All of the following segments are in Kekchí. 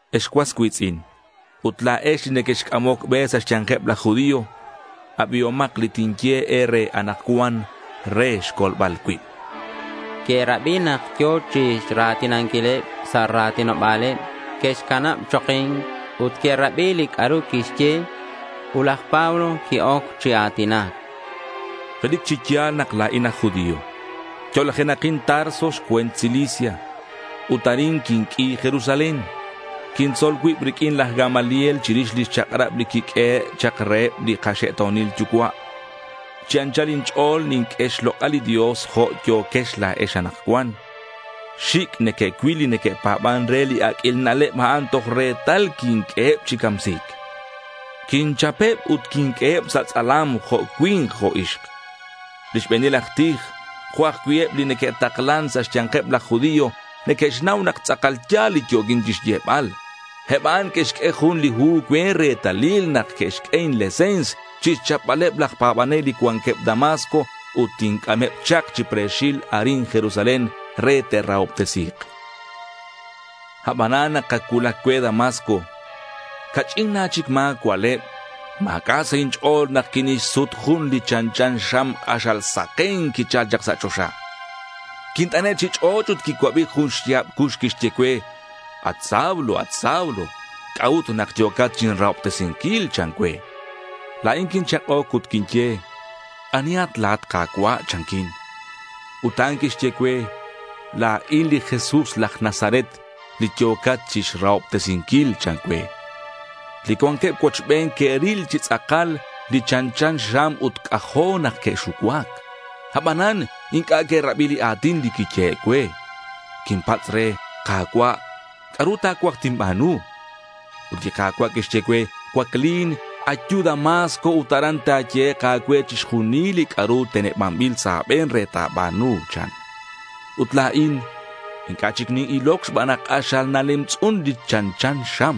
Ex cuas cui̱tz'in, ut la̱ex li nequexc'amoc be sa' xya̱nkeb laj judío. Abihomak li tinye e̱re anakcuan re xcolbal cuib, chan. Que'rabi nak yo̱ chira̱tinanquileb sa' ra̱tinoba̱leb. Que'xcanab choki̱nc ut que'rabi li c'a'ru quixye. Ut laj Pablo qui-oc chi a̱tinac. —Relic chi ya̱l nak la̱in aj judío. Yo'lajenakin Tarso xcue̱nt Cilicia. Ut arin quinq'ui Jerusalén. Quintzol cuib riq'uin laj Gamaliel chirix li chak'rab li quiq'uehe' chak reheb li kaxe'to̱nil yucua'. Chi anchal inch'o̱l ninq'ue xlok'al li Dios jo' yo̱quex la̱ex anakcuan. Xic' neque'cuil li neque'pa̱ban re li aq'uil na'leb a'in toj retal quinq'ueheb chi camsi̱c. Quinchapeb ut quinq'ueheb sa' tz'alam, jo' cui̱nk jo' ixk. Li xbe̱nil aj tij, jo' ajcui' eb li neque'taklan sa' xya̱nkeb laj judío, neque'xnau nak tz'akal ya̱l li yo̱quin chixyebal. Eb a'an que'xq'ue jun li hu cue retalil nak que'xq'ue inlese̱ns chixchapbaleb laj pa̱banel li cuanqueb Damasco, ut tinc'ameb chak chi pre̱xil arin Jerusalén re te'rahobtesi̱k. Abanan nak ac cuulac cue Damasco, ca'ch'in na chic ma̱ cua'leb, ma̱c'a' sa' inch'o̱l nak quinixsut jun li chanchan xam k'axal saken quichal chak sa' choxa. Quint'ane' chi ch'och' ut quicuabi jun xya̱b cux quixye cue, “At Saulo, at Saulo, ¿c'a'ut nak yo̱cat chinrahobtesinquil?” chan cue. La̱in quinchak'oc ut quinye, “¿Anihat la̱at, Ka̱cua'?” chanquin. Ut a'an quixye cue, “La̱in li Jesús laj Nazaret li yo̱cat chixrahobtesinquil,” chan cue. Li cuanqueb cuochben que'ril chi tz'akal li chanchan xam ut c'ajo' nak que'xucuac. Abanan inc'a' que'rabi li a̱tin li quiyehe' cue. Quinpatz' re, “Ka̱cua', ¿c'a'ru ta̱cuaj tinba̱nu?” Ut li Ka̱cua' quixye cue, “Cuaclin. Ayu Damasco ut aran ta̱yehek' a̱cue chixjunil li c'a'ru tenebanbil sa' a̱be̱n re ta̱ba̱nu,” chan. Ut la̱in inc'a' chic nin-iloc xban nak k'axal nalemtz'un li chanchan xam.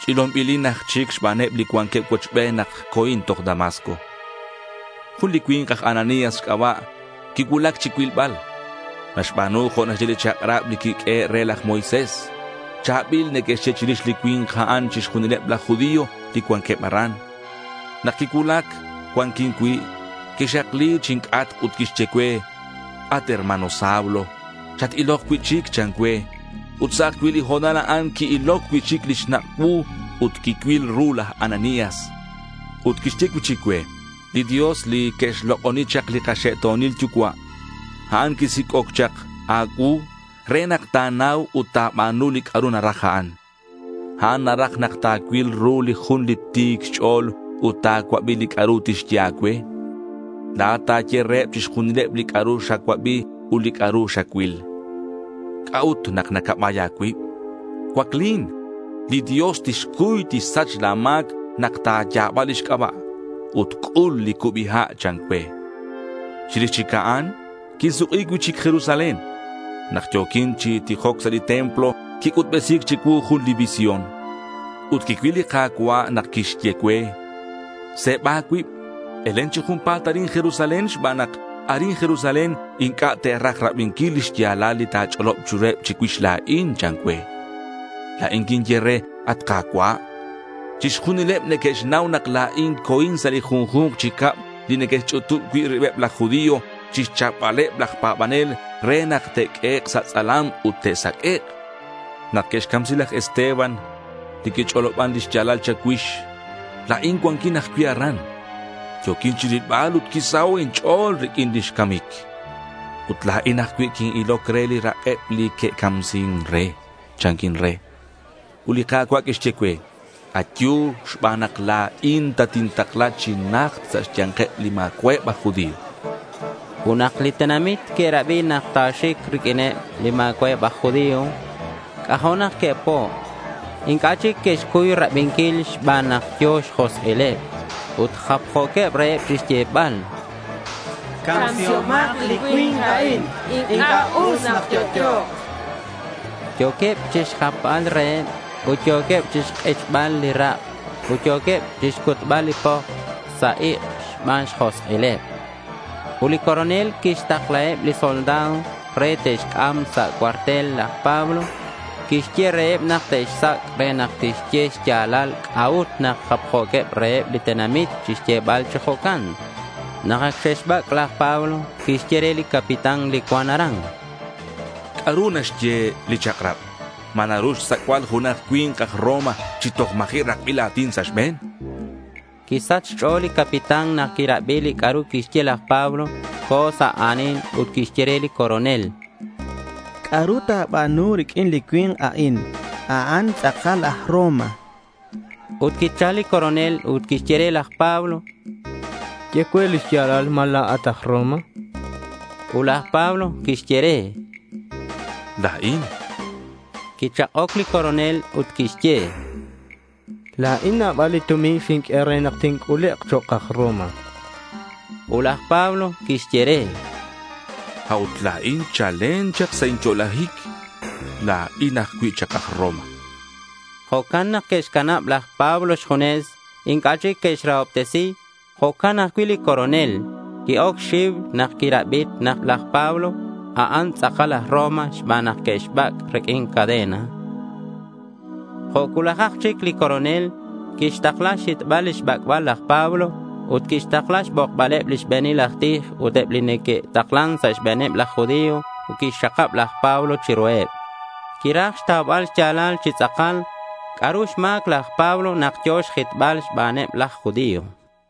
Ch'ilonbilin aj chic xbaneb li cuanqueb cuochben nak co̱in toj Damasco. Jun li cui̱nk aj Ananías xc'aba' quicuulac chicuilbal. Naxba̱nu jo' naxye li chak'rab li quiq'uehe' re laj Moisés. Cha̱bil neque'xye chirix li cui̱nk a'an chixjunileb laj judío li cuanqueb aran. Nak quicuulac cuanquin cui', quixakli chinc'atk ut quixye cue, “At hermano Saulo, chat-ilok cui'chic,” chan cue. Ut sa' ajcui' li ho̱nal a'an qui-iloc cui'chic li xnak' cuu ut quicuil ru laj Ananías. Ut quixye cui'chic cue, “Li Dios li que'xlok'oni chak li kaxe'to̱nil yucua', a'an quisic'oc chak a̱cuu re nak ta̱nau ut ta̱ba̱nu li c'a'ru naraj a'an. A'an naraj nak ta̱cuil ru li jun li Ti̱c Xch'o̱l ut ta̱cuabi li c'a'ru tixye a̱cue. La̱at ta̱ye reheb chixjunileb li c'a'ru xacuabi ut li c'a'ru xacuil. ¿C'a'ut nak nacabay a̱cuib? Cuaclin. Li Dios tixcuy tixsach la̱ ma̱c nak ta̱ya̱ba lix c'aba'. Ut c'ul li cubi ha',” chan cue. Chirix chic a'an, quinsuk'i cui'chic Jerusalén. Nak yo̱quin chi tijoc sa' li templo, quic'utbesi̱c chicuu jun li visión. Ut quicuil li Ka̱cua' nak quixye cue, “Se̱ba a̱cuib. Elen chi junpa̱t arin Jerusalén xban nak arin Jerusalén inc'a' te'raj rabinquil li xya̱lal li ta̱ch'olob chiruheb chicuix la̱in,” chan cue. La̱in quinye re, “At Ka̱cua', chixjunileb neque'xnau nak la̱in co̱in sa' li junju̱nk chi cab li neque'xch'utub cui' ribeb laj judío chixchapbaleb laj pa̱banel re nak te'q'uehek' sa' tz'alam ut te'saq'uek'. Nak que'xcamsi laj Esteban li quich'oloban li xya̱lal cha̱cuix, la̱in cuanquin ajcui' aran. Yo̱quin chirilbal ut quisaho' inch'o̱l riq'uin lix camic. Ut la̱in ajcui' quin-iloc re li rak'eb li que'camsin re,” chanquin re. Ut li Ka̱cua' quixye cue, “Ayu xban nak la̱in tatintakla chi najt sa' xya̱nkeb li ma̱cua'eb aj judío,” chan cue, chan laj Pablo. Ut nak li tenamit que'rabi nak ta̱xic riq'uineb li ma̱cua'eb aj judío, c'ajo' nak que'po'. Inc'a' chic que'xcuy rabinquil xban nak yo̱ xjosk'ileb. Ut japjo̱queb reheb chixyebal: —Camsihomak li cui̱nk a'in. Inc'a' us nak yo'yo̱k, chanqueb. Yo̱queb chixjapbal reheb ut yo̱queb chixk'ichbal li rak' ut yo̱queb chixcutbal li poks sa' ik' xban xjosk'ileb. Ut li coronel quixtaklaheb li soldado re te'xc'am sa' cuartel laj Pablo. Quixye reheb nak te'xsac' re nak tixye xya̱lal c'a'ut nak japjo̱queb reheb li tenamit chixyebal chi jo'can. Nak ac xe'xbac', laj Pablo quixye re li capitán li cuan aran: —¿C'a'ru naxye li chak'rab? ¿Ma naru xsac'bal junak cui̱nk aj Roma chi toj ma̱ji' rakbil a̱tin sa' xbe̱n? chan. Quisach xch'o̱l li capitán nak quirabi li c'a'ru quixye laj Pablo. Co̱ sa' a̱nil ut quixye re li coronel: —¿C'a'ru ta̱ba̱nu riq'uin li cui̱nk a'in? A'an tz'akal aj Roma, chan. Ut quichal li coronel ut quixye re laj Pablo: —Ye cue li xya̱lal. ¿Ma la̱at aj Roma?— Ut laj Pablo quixye re: —La̱in.— Quichak'oc li coronel ut quixye: —La̱in nabal li tumin xinq'ue re nak tinc'ulek' chok' aj Roma, chan. Ut laj Pablo quixye re: —A'ut la̱in chalen chak sa' inyo'lajic, la̱in ajcui' chak aj Roma, chan. Jo'can nak que'xcanab laj Pablo xjunes. Inc'a' chic que'xrahobtesi. Jo'can ajcui' li coronel. Qui-oc xxiu nak quixnau nak laj Pablo a'an tz'akal aj Roma xban nak que'xbac' riq'uin cadena. Jo' cuulajak chic li coronel quixtakla xhitbal lix bac'bal laj Pablo. Ut quixtakla xbokbaleb lix be̱nil aj tij ut eb li neque'taklan sa' xbe̱neb laj Judío ut quixxakab laj Pablo chiruheb. Quiraj xtaubal xya̱lal chi tz'akal c'a'ru xma̱c laj Pablo nak yo̱ xjitbal xbaneb laj judío.